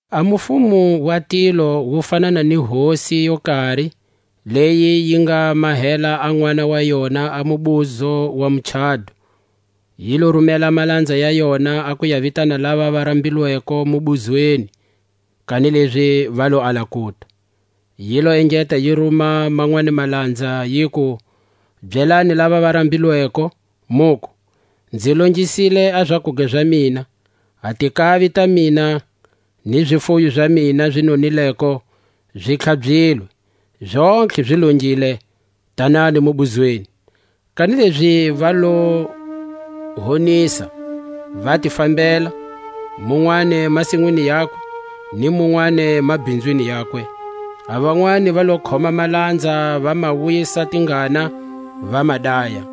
A mufumo wa tilo wu fanana ni hosi yo kari, leyi yi nga mahela a nʼwana wa yona a mubuzo wa muchado. Yi lo rumela a malanza ya yona a ku ya vitana lava va rambilweko mubuzweni; kanilezi va lo ala kuta. Yi lo engeta yi ruma manwani malanza, yiku: Byelani lava va rambilweko, muku: Nzi longisile a zakuga za mina; a tinkavi ta mina ni zifuyo za mina zi nonileko zi tlhabyilwe; zontlhe zi longile. Tanani mubuzweni. Kanilezi va lo honisa, va ti fambela; munwani masinwini yakwe, ni munwani mabhinzwini yakwe. A vanwani va lo khoma malanza, va ma wisa tingana, va ma daya.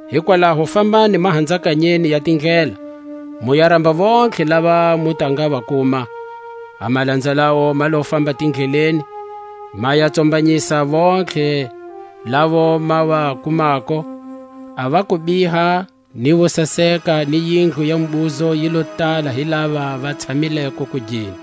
Hikwalaho fambani mahanzakanyeni ya tindlela, mu ya ramba vontlhe lava mu ta nga va kuma. A malanza lawo ma lo famba tindleleni, ma ya tsombanyisa vontlhe lavo ma va kumako, a va kubiha, ni vo saseka ni yindlu ya mubuzo yi lo tala hi lava va tshamileko kugeni.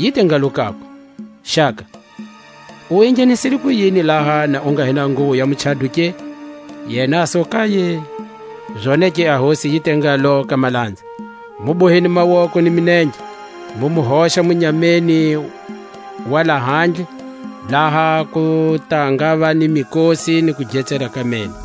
Yi te ngalo kakwe: Xaka, u enghenisile kuyini laha na u nga hi na nguwo ya muchado ke? Yena a su kaye. Zonake a hosi yi te ngalo ka malanza: Mu boheni mawoko ni milenge, mu mu hoxa munyameni wa lahandle, laha ku ta ngava ni mikosi ni kugetsela ka meno.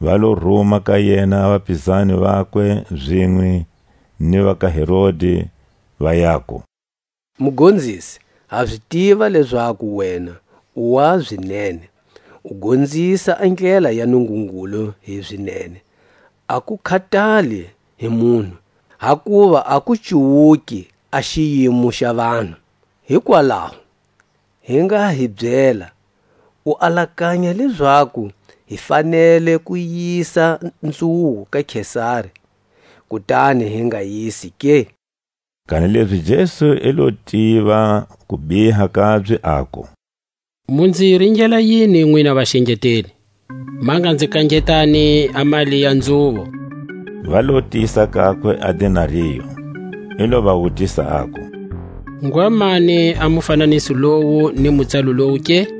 Va lo ruma ka yena a vapizani vabye zinwe ni va ka Herodi, va yaku: Mugonzisi, ha zi tiva lezaku wena u wa zinene, u gonzisa a ndlela ya Nungungulu hi zinene; a ku khatali hi munhu, hakuva a ku cuwuki a xiyimo xa vanhu. Hikwalaho, hi nga hi byela, U alakanya lezaku hi fanele ku yisa nzhuvo ka Kesari, kutani hi nga yisi ke? Kanilezi Jesu i lo tiva a kubiha kabye, aku: Mu nzi ringela yini, nwina vaxengeteli? Ma nga nzi kangetani a mali ya nzhuvo. Va lo tisa kakwe a denario. I lo va wutisa, aku: Ngwa mani a mufananiso lowu ni mutsalo lowu ke?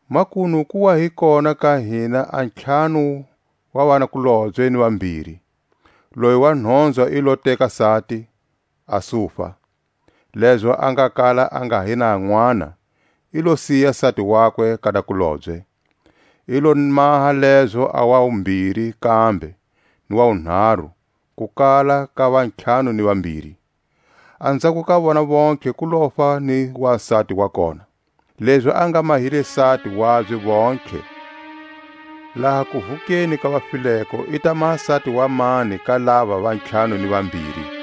Makunu ku wa hi kona ka hina a ntlhanu wa vanakulobye ni vambiri; loyi wa nhonzwa i lo teka sati, a sufa. Lezo a nga kala a nga hi na nʼwana, i lo siya sati wakwe ka nakulobye; i lo maha lezo a wa wumbiri kambe, ni wa wunharu, ku kala ka vantlhanu ni vambiri. Anzhako ka vona vontlhe ku lofa ni wasati wa kona. Lezi a nga mahile sati wabye vontlhe, laha kuvukeni ka vafileko i ta maha sati wa mani ka lava va ntlhanu ni vambiri?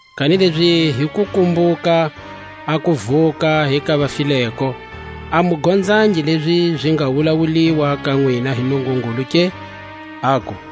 Kanilezi hi ku kumbuka a kuvuka hi ka vafileko, a mu gonzangi lezi zi nga wulawuliwa ka nwina hi Nungungulu ke, aku: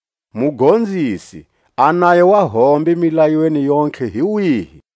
Mugonzisi, a nayo wa hombe milayweni yontlhe hi wihi?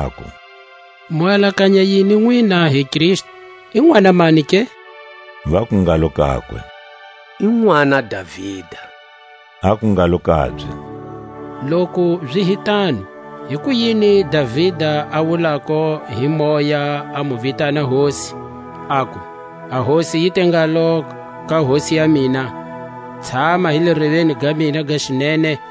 aku: Mu alakanya yini nwina hi Kristu? I nʼwana mani ke? Vaku ngalo kakwe: I nʼwana Davida. Aku ngalo kabye: Loku zi hi tano, hikuyini Davida a wulako hi Moya a mu vitana Hosi, aku: A Hosi yi te ngalo ka Hosi ya mina: Tshama hi le reveni ga mina ga xinene;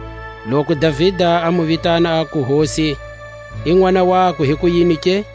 Loku Davida a mu vitana aku Hosi, i nʼwana wakwe hikuyini ke?